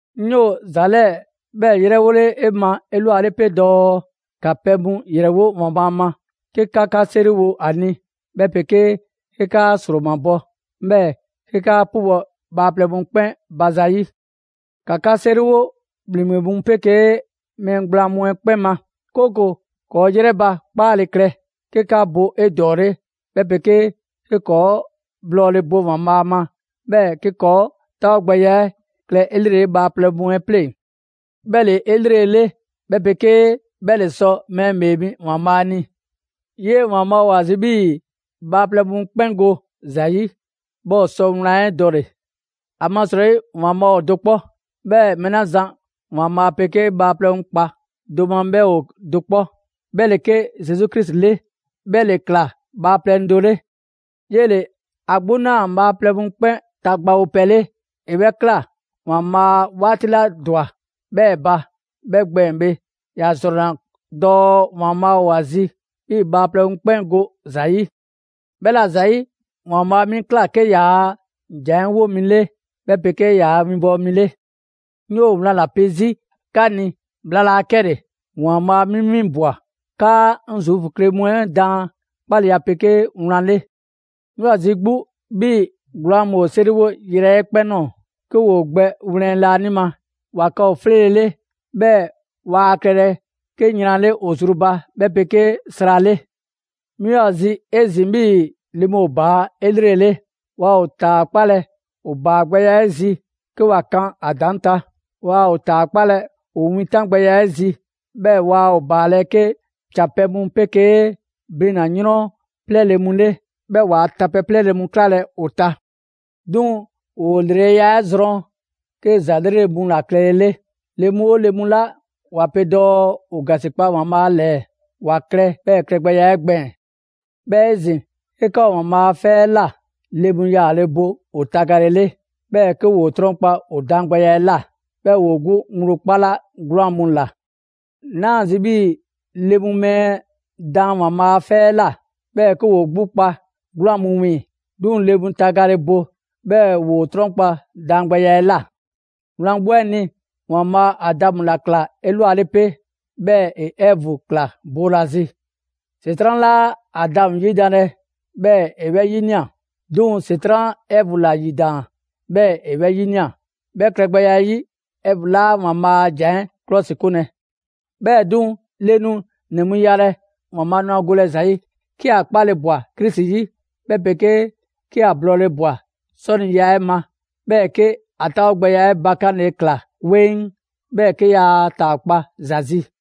'Ŋ 'yoo‑ ‑za 'lɛɛ‑ 'bhɛɛ‑ 'yrɛwole ma 'elwale 'pe dɔɔ ‑ka pɛ mu ‑yrɛwo' ‑Waanbhaa' ma, 'ke 'ka 'ka 'seriwo a ni, 'bhɛ 'pegee 'ke 'kaa 'sromabɔ, 'bhɛɛ‑ 'ke 'kaa 'pubɔ‑ bhaaplɛŋ mu 'kpɛn ba zayi'. ‑Ka 'ka 'seriwo ‑bhleŋgbe mu 'pegee mɛɛ gblaan mu 'ɛ 'kpɛn ma, 'kooko‑ ‑kɔɔ' 'yrɛ ba 'kpaale‑ klɛ, 'ke ‑kɔɔ' bo 'edɔɔle, 'bhɛ 'pegee 'ke ‑kɔɔ' blɔɔle bo ‑Waanbhaa' ma, 'bhɛɛ‑ 'ke ‑kɔɔ' 'taawogbɛya 'ɛ klɛ 'elrele bhaaplɛŋ mu 'ɛ 'pleŋ‑. 'Bhɛ ‑le 'elrele 'bhɛ 'pegee 'bhɛ ‑le sɔ mɛɛ ‑Bhee Mi ‑Waanbhaa' ni. 'Yee‑ ‑Waanbhaa' ‑o ‑a zi 'bhii‑ bhaaplɛŋ mu 'kpɛn go ‑za 'yi, 'bhɛɛ ‑o sɔ wlan 'ɛ dɔle‑. ‑Amasrɔyi ‑Waanbhaa' ‑o do 'kpɔ, 'bhɛɛ‑ mɛɛ 'la zan ‑Waanbhaa' 'pegee bhaaplɛŋ mu kpa do ma 'bhɛ ‑o do 'kpɔ: 'bhɛ ‑le 'ke Zesu Krisi 'le, 'bhɛ ‑le ꞊kla bhaaplɛŋ do 'le. 'Yele‑ 'a 'gbu 'naa‑ bhaaplɛŋ mu 'kpɛn ta gbawopɛ 'le; ‑e 'bhɛ 'kla‑ ‑Waanbhaa' 'waati 'la ‑dwa 'bhɛɛ‑ ba, 'bhɛ gbɛɛn‑ bhe, ‑ya ‑zrɔnna dɔɔ ‑Waanbhaa' ‑o ‑a zi 'bhii‑ bhaaplɛŋ mu 'kpɛn go ‑za 'yi. 'Bhɛla‑ ‑zayi', ‑Waanbhaa' 'mi ꞊kla 'ke ‑yaa' ‑jan 'ɛ 'wo mi 'le 'bhɛ 'pegee ‑yaa' winbɔwo mi 'le. 'Ŋ 'yoo‑ wlan ‑la pe 'zi 'ka ni, bhla laa 'kɛle‑! ‑Waanbhaa' 'mi 'winbwa‑ 'kaa 'ŋ Zuufu kle mu 'ɛ daan 'kpaleya 'pegee wlan 'le. 'Ŋ 'yoo‑ ‑a zi 'gbu 'bhii‑ 'gwlaan‑ mu ‑o 'seriwo yrɛ 'ɛ 'kpɛn ꞊nɔɔ 'ke ‑woo gbɛ wlɛn laanima. ‑Wa klɛ ‑o 'fleele‑ 'le, 'bhɛɛ‑ waa klɛlɛ 'ke yran 'le ‑o zru ba, 'bhɛ 'pegee sra 'le. 'Mi ‑o ‑a zi 'ezin‑ 'bhii‑ le mu ‑o ‑baa' 'elrele. Waa ‑o ‑taakpalɛ ‑o ‑baa gbɛya 'ɛ 'zi 'ke ‑wa kan ‑a ‑daŋ' ta. Waa ‑o ‑taakpalɛ ‑o wintangbɛya 'ɛ zi; 'bhɛɛ‑ waa ‑o ‑baalɛ' 'ke ‑can pɛ mu 'pegee blina‑ 'yrɔnnɛ 'plɛɛle‑ mu 'le, 'bhɛɛ‑ waa tapɛ 'plɛɛle‑ mu 'klalɛ‑ ‑o ta. 'Duŋ‑ ‑woo ‑lreleya 'ɛ zrɔn 'ke ‑za 'lrele‑ mu ‑la klɛle 'le. Le mu 'oo le mu 'la ‑wa pe dɔɔ ‑o ‑gasikpa ‑Waanbhaa' ‑lɛɛ, ‑wa klɛ 'bhɛɛ‑ klɛgbɛya 'ɛ gbɛɛn‑. 'Bhɛɛ‑ 'ezin‑, 'ke 'ka ‑o ‑Waanbhaa' a 'fɛ 'ɛ ꞊la, le mu yaale bo ‑o tagalele, 'bhɛɛ‑ 'ke ‑woo 'trɔnkpa‑ ‑o daangbɛya 'ɛ ꞊la; 'bhɛɛ‑ ‑woo 'gbu ŋgblo 'kpala 'gwlaan‑ mu ꞊la. 'Naa ‑a zi 'bhii‑ le mu mɛɛ daan ‑Waanbhaa' a 'fɛ 'ɛ ꞊la, 'bhɛɛ‑ 'ke ‑woo 'gbu kpa 'gwlaan‑ mu wiiŋ‑. 'Duŋ‑ le mu tagale bo, 'bhɛɛ‑ ‑woo 'trɔnkpa daangbɛya 'ɛ ꞊la. Wlan 'gbu 'ɛ ni, ‑Waanbhaa' Adamu ‑la ‑kla 'elwale 'pe, 'bhɛɛ‑ ‑e Ɛvu ‑kla boolazi. ‑Setran' 'laa Adamu ‑yidanlɛ, 'bhɛɛ‑ ‑e 'bhɛ 'yinia‑; 'duŋ‑ ‑Setran' Ɛvu ‑la 'yidaan‑, 'bhɛɛ‑ ‑e 'bhɛ 'yinia꞊. 'Bhɛ klɛgbɛya 'ɛ 'yi Ɛvu 'laa ‑Waanbhaa' a ‑jan 'ɛ 'klɔsikunlɛ. 'Bhɛɛ‑ 'duŋ‑, le nu ‑nɛ mu yalɛ; ‑Waanbhaa' nu ‑a golɛ ‑za 'yi 'ke ‑a 'kpale ꞊bwa Krisi 'yi, 'bhɛ 'pegee 'ke ‑o blɔɔle ꞊bwa 'sɔniya 'ɛ ma. 'Bhɛɛ‑ 'ke ‑o 'taawogbɛya 'ɛ bakanle ꞊kla 'weŋ, 'bhɛɛ‑ 'ke yaa ‑taakpa' ‑za zi.